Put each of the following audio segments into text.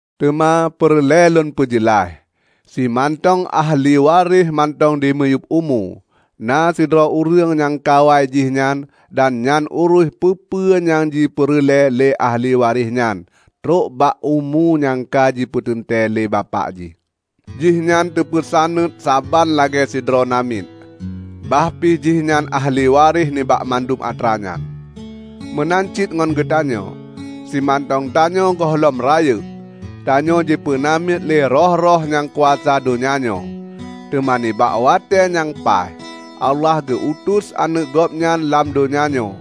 Teuma peureulée lôn peujeulaih: simantong ahli waréh mantong dimiyueb umu, na sidroe ureuëng nyang kawai jihnyan dan nyang uruih peue-peue nyang jipeureulée lé ahli waréh nyan trok ubak umu nyang ka jipeuteuntée lé bapak jih. Jihnyan teupeusaneuet saban lagée sidroe namiet, bah pi jihnyan ahli waréh nibak mandum atra nyan. Meunan cit ngon geutanyoe: Simantong tanyoe gohlom rayeuk, tanyoe jipeunamiet lé roh-roh nyang kuasa donya nyoe. Teuma nibak watée nyang paih, Allah geu-utus Aneuëk Gobnyan lam donya nyoe.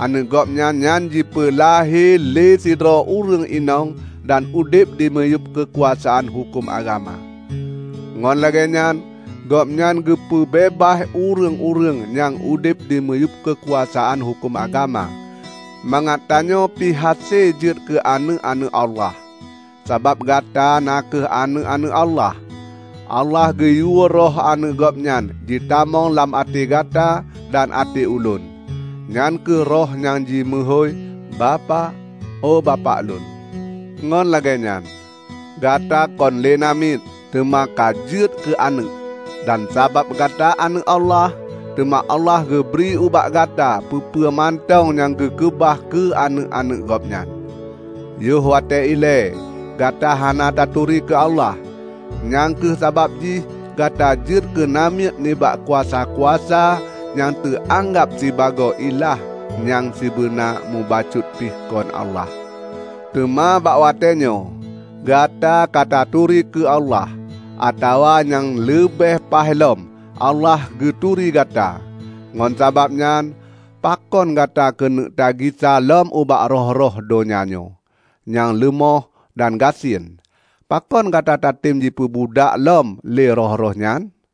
Aneuëk Gobnyan nyan jipeulahé lé sidroe ureuëng inong dan udeb dimiyueb keukuasaan huköm agama. Ngon lagée nyan Gobnyan geupeu beubaih ureuëng-ureuëng nyang udeb dimiyueb keukuasaan huköm agama; mangat tanyoe pih hase jeuet keu aneuëk-aneuëk Allah. Sabab gata na kheueh aneuëk-aneuëk Allah, Allah geuyue Roh Aneuëk Gobnyan jitamong lam até Gata dan até ulôn, nyan kheueh Roh nyang jimeuhôi, "Bapak, oe Bapak lôn." Ngon lagée nyan, gata kon lé namiet, teuma ka jeuet keu aneuëk. Dan sabab gata aneuëk Allah, teuma Allah geubri ubak gata peue-peue mantong nyang geukeubah keu aneuëk-aneuëk Gobnyan. Yoh watée ilée gata hana taturi keu Allah, nyang kheueh sabab jih gata jeuet keu namiet nibak kuasa-kuasa nyang teuanggab sibagoe ilah nyang sibeuna mubacut pih kon Allah. Teuma bak watéenyoe gata ka taturi keu Allah, atawa nyang leubeh paih lom, Allah geuturi gata. Ngon sabab nyan, pakon gata keuneuk tagisa lom ubak roh-roh donya nyoe, nyang leumoh dan gasien? Pakon gata tatem jipeubudak lom lé roh-roh nyan?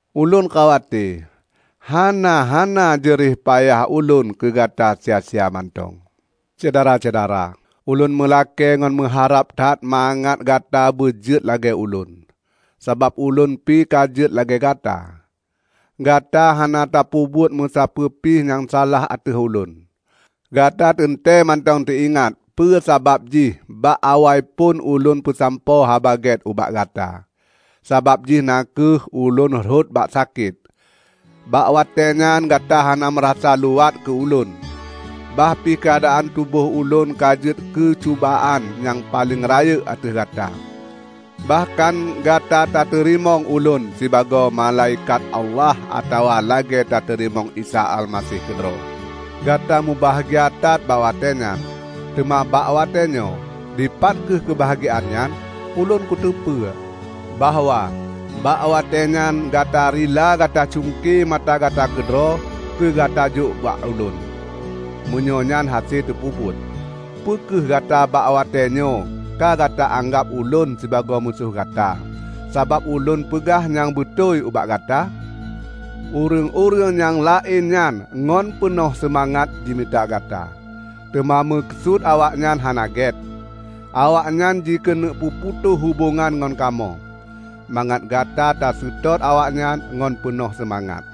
Ulôn khawate, hana-hana jeuréh payah ulôn keugata sia-sia mantong. Syedara-syedara! Ulôn meulakée ngon meuharab that mangat gata beujeuet lagée ulôn. Sabab ulôn pi ka jeuet lagée gata. Gata hana tapeubuet musapeue pih nyang salah ateueh ulôn. Gata teuntée mantong teuingat peue sabab jih bak awaiphon ulôn peusampoe Haba Gét ubak gata. Sabab jih na kheueh ulôn rhot bak sakét. Bak watée nyan gata hana meurasa luwat keu ulôn, bah pih keuadaan tuboh ulôn ka jeuet keucubaan nyang paleng rayeuk ateueh gata. Bahkan gata tateurimong ulôn sibagoe malaikat Allah atawa lagée tateurimong Isa Almaseh keudroe. Gata mubahgia that bak watée nyan. Teuma bak watée nyoe, dipat kheueh keubahgiaan nyan? Ulôn kuteupeue bahwa bak watée nyan gata rila gata cungke mata gata keudroe keugata jok ubak ulôn, meunyoe nyan hase teupeubuet. Peu kheueh gata bak watéenyoe ka gata anggab ulôn sibagoe musoh gata, sabab ulôn peugah nyang beutôi ubak gata? Ureuëng-ureuëng nyang laén nyan ngon peunoh seumangat jimita gata, teuma meukeusut awaknyan hana gét. Awaknyan jikeuneuk peuputôh hubongan ngon kamoe, mangat gata taseutôt awaknyan ngon peunoh seumangat.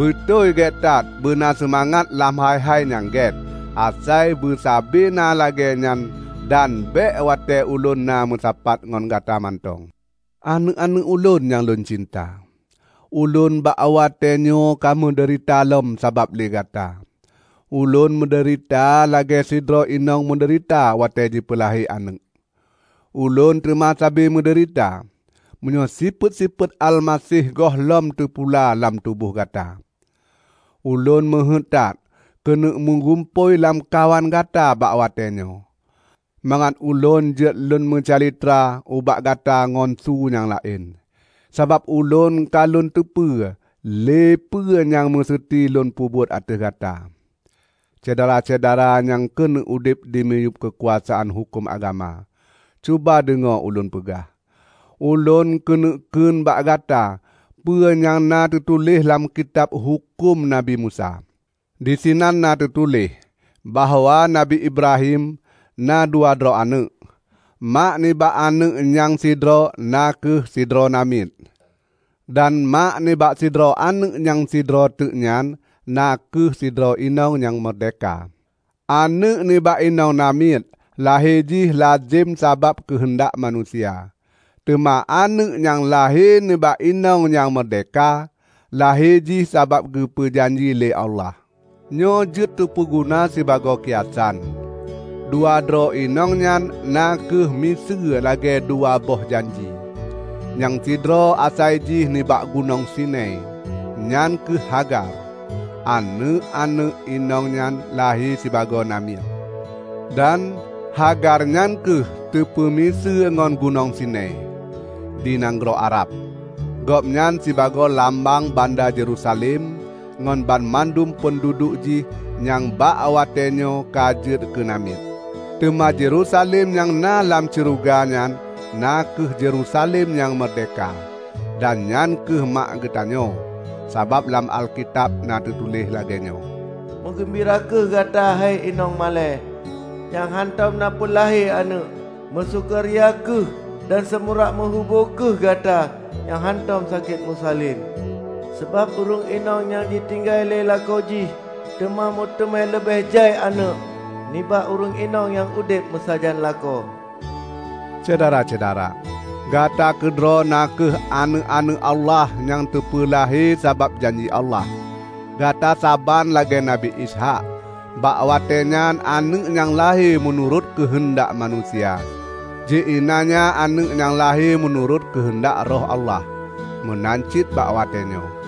Beutôi gét that beuna seumangat lam hai-hai nyang gét, asai beusabe na lagée nyan dan bék watée ulôn na meusapat ngon gata mantong. Aneuëk-aneuëk ulôn nyang lôn cinta! Ulôn bak watée nyoe ka meudeurita lom sabab lé gata. Ulôn meudeurita lagée sidroe inong meudeurita watée jipeulahé aneuëk. Ulôn teuma sabe meudeurita, meunyoe sifeuet-sifeuet Almaseh gohlom teupula lam tuboh gata! Ulôn meuheuét that keuneuk meugumpôi lamkawan gata bak watée nyoe, mangat ulôn jeuet lôn meucalitra ubak gata ngon su nyang laén, sabab ulôn ka lôn teupeue lé peue nyang meuseuti lôn peubuet ateueh gata! Syedara-syedara nyang keuneuk udeb dimiyueb keukuasaan huköm agama, cuba deungoe ulôn peugah! Ulôn keuneuk kheun bak gata peue nyang na teutuléh lam Kitab Huköm Nabi Musa. Disinan na teutuléh bahwa Nabi Ibrahim na dua droe aneuëk: Mak nibak aneuëk nyang sidroe na kheueh sidroe namiet, dan mak nibak sidroe aneuëk nyang sidroe teuk nyan na kheueh sidroe inong nyang meurdehka. Aneuëk nibak inong namiet lahé jih lazem sabab keuheundak manusia. Teuma aneuëk nyang lahé nibak inong nyang meurdehka, lahé jih sabab geupeue janji lé Allah. Nyoe jeuet tapeuguna sibagoe kiasan. Dua droe inong nyan na kheueh miseue lagée dua boh janji: nyang sidroe asai jih nibak Gunong Sinai -- nyan kheueh Hagar; aneuëk-aneuëk inong nyan lahé sibagoe namiet. Dan, Hagar nyan kheueh teupeumiseue ngon Gunong Sinai, di nanggroe Arab. Gobnyan sibagoe lambang banda Yerusalem ngon banmandum peunduduek jih nyang bak watée nyoe ka jeuet keunamiet. Teuma Yerusalem nyang na lam syeuruga nyan na kheueh Yerusalem nyang meurdehka, dan nyan kheueh mak geutanyoe. Sabab lam Alkitab teutuléh lagée nyoe, "Meugeumbira kheueh gata he inong malée, nyang hántom na peulahé aneuëk! Meusukaria kheueh dan seumurak meuhubo kheueh gata nyang hántom sakét meusalen! Sabab ureuëng inong nyang jitinggai lé lakoe jih teuma meuteumé leubeh jai aneuëk nibak ureuëng inong nyang udeb meusajan lakoe." Syedara-syedara! Gata keudroe na kheueh aneuëk-aneuëk Allah nyang teupeulahé sabab janji Allah; gata saban lagée Nabi Ishaq. Bak watée nyan aneuëk nyang lahé meunurot keuheundak manusia, ji iélanya aneuëk nyang lahé meunurot keuheundak Roh Allah. Meunan cit bak watée nyoe.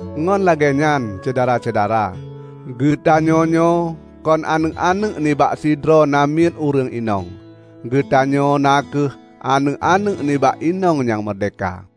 Ngon lagée nyan, Syedara-syedara, geutanyonyoe kon aneuëk-aneuëk nibak sidroe namiet ureuëng inong; geutanyoe na kheueh aneuëk-aneuëk nibak inong nyang meurdehka.